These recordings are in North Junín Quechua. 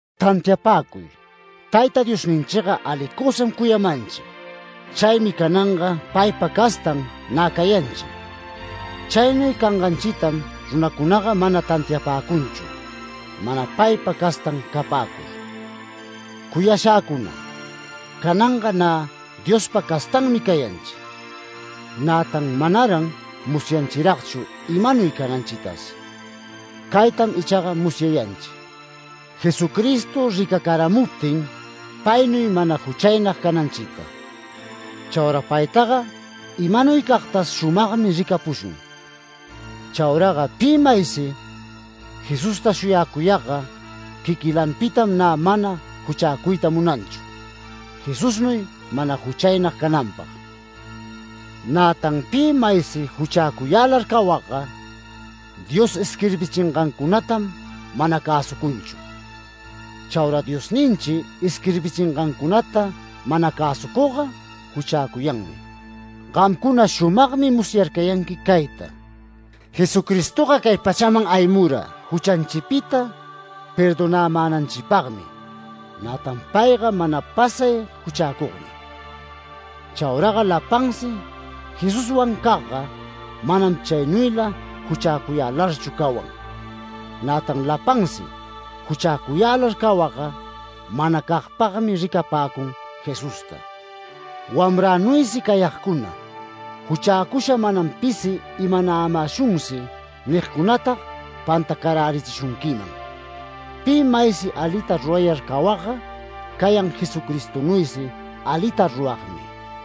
Tantiapäcuy, Tayta Diosninchiga alicusam cuyamanchi. Chaymi cananga paypa castan nä cayanchi. Chaynuy canganchitam runacunaga mana tantiapäcunchu, mana paypa castan capäcur. Cuyashäcuna, cananga nä Diospa castanmi cayanchi. Nätan manaran musyanchiragchu imanuy cananchitas. Caytam ichaga musyayanchi: Jesucristo ricacaramuptin, paynuy mana juchaynag cananchita. Chaura paytaga imanuycagtas shumagmi ricapushun. Chauraga pi maysi Jesusta shuyacuyagga, quiquilanpitam nä mana juchäcuyta munanchu, Jesusnuy mana juchaynag cananpag. Nätan pi maysi juchäcuyälar cawagga, Dios isquirbichingancunatam mana cäsucunchu. Chaura Diosninchi isquirbichingancunata mana cäsucugga, juchäcuyanmi. Gamcuna shumagmi musyarcayanqui cayta: Jesucristoga cay pachaman aymura juchanchipita perdonämänanchipagmi, nätan payga mana pasay juchäcugmi. Chauraga lapansi Jesuswancagga, manam chaynuyla juchäcuyälarchu cawan. Nätan lapansi juchäcuyälar cawagga manacagpagmi ricapäcun Jesusta. Wamränuysi cayagcuna, “Juchäcusha manam pisi imanämäshunsi” nigcunatag pantacarärichishunquiman. Pi maysi alita rurayar cawagga, cayan Jesucristonuysi alita ruragmi.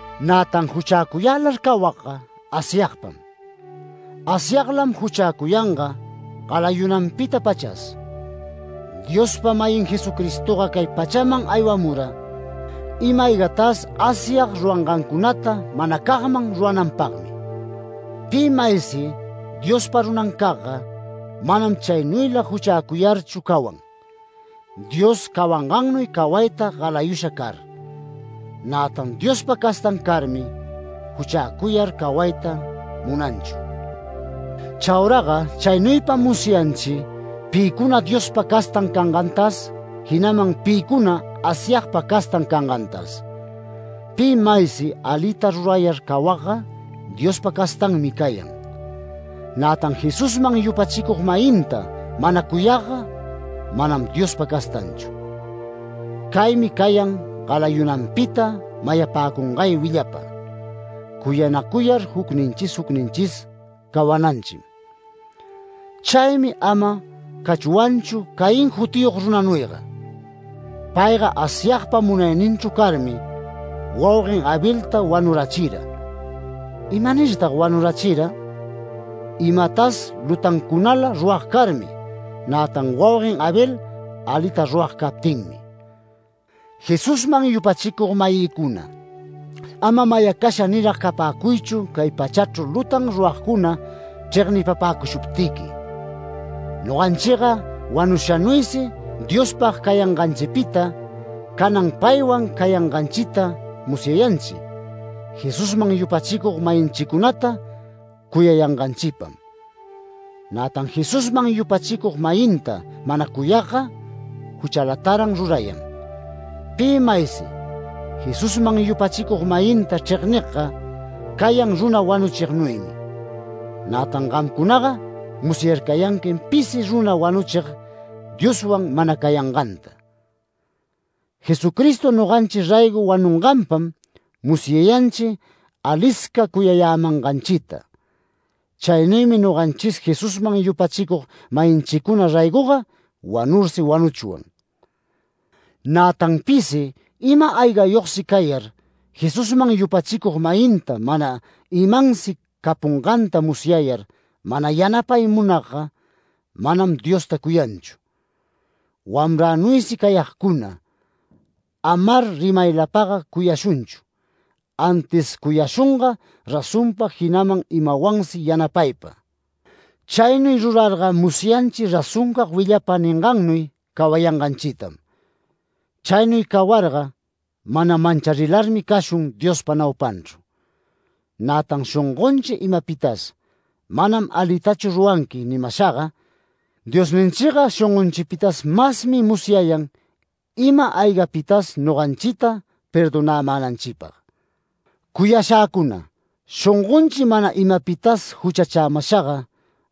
Nätan juchäcuyälar cawagga Asyagpam. Asyaglam juchäcuyanga galayunanpita-pachas. Diospa-mayin Jesucristoga cay pachaman aywamura, ima-aygatas Asyag rurangancunata manacagman rurananpagmi. Pi maysi Diospa runancagga, manam chaynuyla juchäcuyarchu cawan, Dios cawangannuy cawayta galayusha car. Nätan Diospa castan carmi juchäcuyar cawayta munanchu. Chauraga chaynuypam musyanchi pïcuna Diospa castan cangantas, jinaman pïcuna Asyagpa castan cangantas. Pi maysi alita rurayar cawagga Diospa castanmi cayan. Nätan Jesusman yupachicug-mayinta mana cuyagga, manam Diospa castanchu. Caymi cayan galayunanpita mayapäcungay willapa: Cuyanacuyar jucninchis jucninchis cawananchim. Chaymi ama cachwanchu Caín jutiyog runanuyga. Payga Asyagpa munayninchru carmi, wauguen Abelta wanurachira. ¿Imanirtag wanurachira? Imatas lutancunala rurag carmi, nätan wauguen Abel alita rurag captinmi. Jesusman yupachicug-mayïcuna, ama mayacasha nirag capäcuychu cay pachachru lutan ruragcuna chregnipapäcushuptiqui. Noganchiga wanushanuysi Diospag cayanganchipita, canan paywan cayanganchita musyayanchi, Jesusman yupachicug-mayinchicunata cuyayanganchipam. Nätan Jesusman yupachicug-mayinta mana cuyagga, juchalataran rurayan. Pi maysi Jesusman yupachicug-mayinta chregnigga, cayan runa wanuchignuymi. Nätan gamcunaga musyarcayanquim pisi runa wanuchig Dioswan mana cayanganta. Jesucristo noganchi raygo wanunganpam musyayanchi alisca cuyayämanganchita. Chaynuymi noganchis Jesusman yupachicug-mayinchicuna raygoga wanursi wanuchwan. Nätan pisi ima-aygayogsi cayar, Jesusman yupachicug-mayinta mana imansi capunganta musyayar mana yanapay munagga, manam Diosta cuyanchu. Wamränuysi cayagcuna, amar rimaylapaga cuyashunchu, antis cuyashunga razonpa, jinaman imawansi yanapaypa. Chaynuy rurarga musyanchi razoncag willapa ningannuy cawayanganchitam. Chaynuy cawarga mana mancharilarmi cashun Diospa naupanchru. Nätan shongonchi imapitas “Manam alitachu ruranqui” nimashaga, Diosninchiga shongonchipitas masmi musyayan ima-aygapitas noganchita perdonämänanchipag. Cuyashäcuna, shongonchi mana imapitas juchachämashaga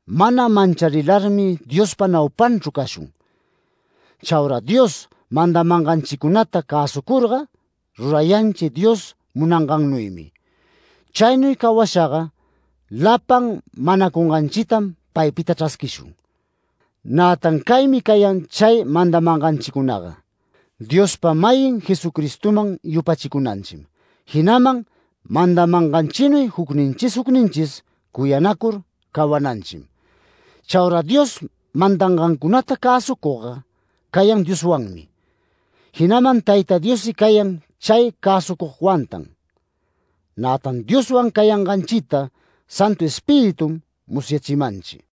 mana mancharilarmi Diospa naupanchru cashun. Chaura Dios mandamanganchicunata cäsucurga rurayanchi Dios munangannuymi. Chaynuy cawashaga lapan manacunganchitam paypita chrasquishun. Nätan caymi cayan chay mandamanganchicunaga: Diospa-mayin Jesucristoman yupachicunanchim, jinaman mandamanganchinuy jucninchis jucninchis cuyanacur cawananchim. Chaura Dios mandangancunata cäsucugga cayan Dioswanmi, jinaman Tayta Diossi cayan chay cäsucugwantan. Nätan Dioswan cayanganchita Santu Espiritum musyachimanchi.